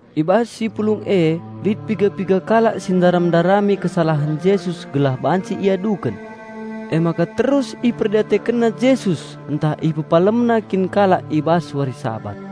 I bas si pulung e lit piga-piga kalak si ndaram-ndarami kesalahen Jesus gelah banci iaduken. Emaka terus iperdiatekenna Jesus ntah IpepalemNa kin kalak i bas wari Sabat.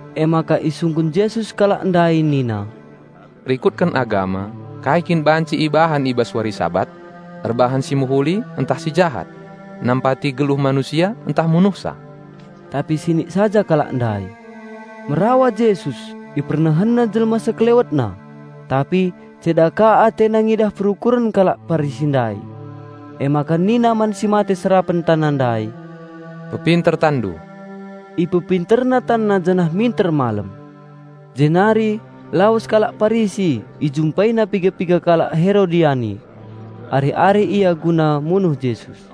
Emaka isungkun Jesus kalak ndai nina, "Rikutken agama, kai kin banci ibahan i bas wari Sabat? Erbahan si mehuli ntah si jahat? Nampati geluh manusia ntah munuhsa?" Tapi sinik saja kalak ndai. Merawa Jesus, IpernehenNa jelma SekelewetNa. Tapi ceda ka AteNa ngidah perukuren kalak Parisi ndai. Emaka nina man si mate serapen tanna ndai, "Pepinter tanndu." Ipepinterna tanna janah minter malem. Jenari lawes kalak Parisi, ijumpaina piga-piga kalak Herodiani. Arih-arih ia guna munuh Jesus.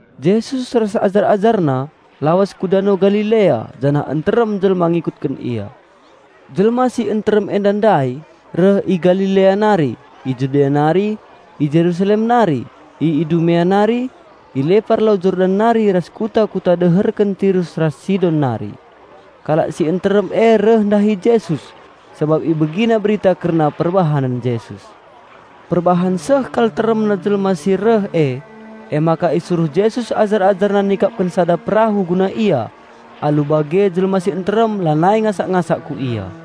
Jesus ras ajar-AjarNa lawes ku Dano Galilea janah nterem jelma ngikutken Ia. Jelma si nterem enda ndai reh i Galilea nari, i Judea nari, i Jerusalem nari, i Idumea nari, i lepar Lau Yordan nari ras kuta-kuta deherken Tirus ras Sidon nari. Kalak si nterem e reh ndahi Jesus sabap ibegina berita kerna perbahanen Jesus. Perbahan seh kal teremna jelma si reh e, emaka isuruh Jesus ajar-AjarNa nikapken sada perahu guna Ia. Alu bage jelma si nterem lanai ngasak-ngasak ku Ia.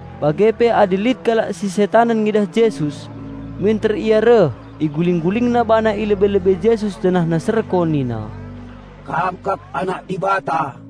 Bage pe adi lit kalak si setanen ngidah Jesus, minter ia reh, iguling-gulingna bana i lebe-lebe Jesus janahna serko nina, "Kam kap Anak Dibata!"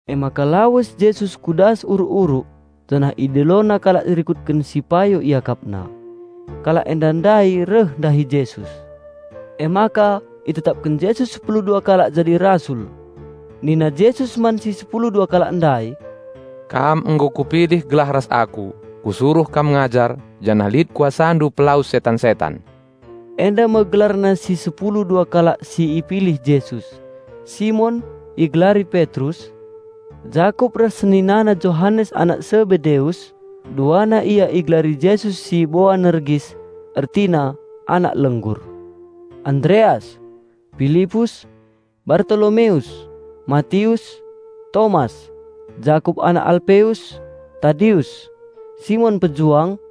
Emaka lawes Jesus ku das uruk-uruk, janah IdiloNa kalak rikutken si payo IakapNa. Kalak enda ndai reh ndahi Jesus. Emaka itetapken Jesus sepulu dua kalak jadi Rasul. Nina Jesus man si sepulu dua kalak ndai, "Kam nggo Kupilih gelah ras Aku. Kusuruh kam ngajar, janah lit kuasandu mpelawes setan-setan." Enda me gelarna si sepulu dua kalak si ipilih Jesus; Simon (igelari Petrus), Jakup ras seninana Johanes anak Sebedeus (duana ia igelari Jesus si Boanergis, ertina, "Anak lenggur"). Andreas, Pilipus, Bartolomeus, Matius, Tomas, Jakup anak Alpeus, Tadius, Simon Pejuang,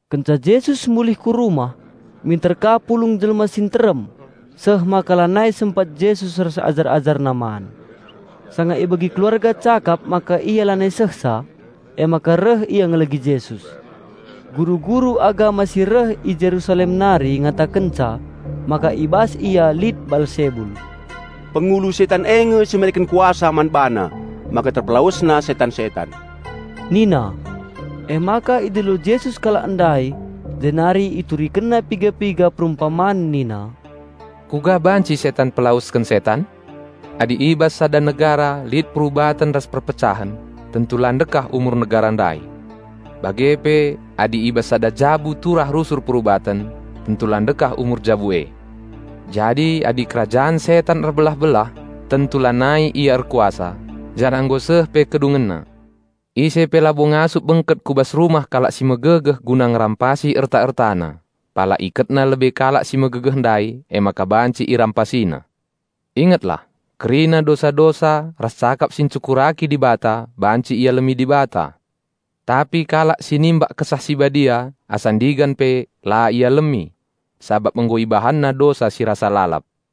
Kenca Jesus mulih ku rumah, minter ka pulung jelma si nterem, seh maka lanai sempat Jesus ras ajar-AjarNa man. Sanga ibegi keluarga cakap maka Ia lanai sehsa, emaka reh ia ngelegi Jesus. Guru-guru agama si reh i Jerusalem nari ngatakenca maka i bas Ia lit Baalsebul. "Pengulu setan e nge si mereken kuasa man BaNa maka TerpelawesNa setan-setan," nina. Emaka idilo Jesus kalak ndai, jenari IturikenNa piga-piga perumpaman nina, "Kuga banci setan mpelawesken setan? Adi i bas sada negara lit perubaten ras perpecahen tentu la ndekah umur negara ndai. Bage pe adi i bas sada jabu turah rusur perubaten, tentu la ndekah umur jabu e. Jadi adi kerajan setan erbelah-belah tentu lanai ia erkuasa, janah nggo seh pe kedungenna. Ise pe labo ngasup bengket ku bas rumah kalak si megegeh guna ngerampasi erta-ertana, pala iketna lebe kalak si megegeh ndai, emaka banci irampasina. Ingetlah! Kerina dosa-dosa ras cakap si enghina Dibata banci ialemi Dibata. Tapi kalak si enghina Kesah Si Badia asa ndigan pe la ialemi. Sabap nggo ibahanna dosa si rasa lalap."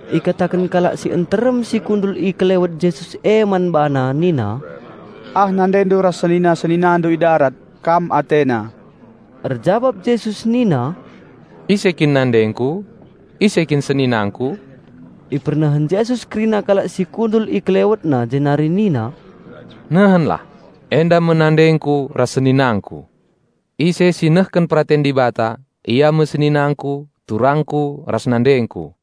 Ikataken kalak si nterem si kundul i kelewet Jesus e man BaNa nina, "Ah NandeNdu ras senina-SeninaNdu i darat, Kam atena." Erjabap Jesus nina, "Ise kin nandengKu? Ise kin seninangKu?" Ipernehen Jesus kerina kalak si kundul i KelewetNa jenari nina, "Nehenlah! Enda me nandengKu ras seninangKu! Ise si nehken peraten Dibata, ia me seninangKu, turangKu ras nandengKu."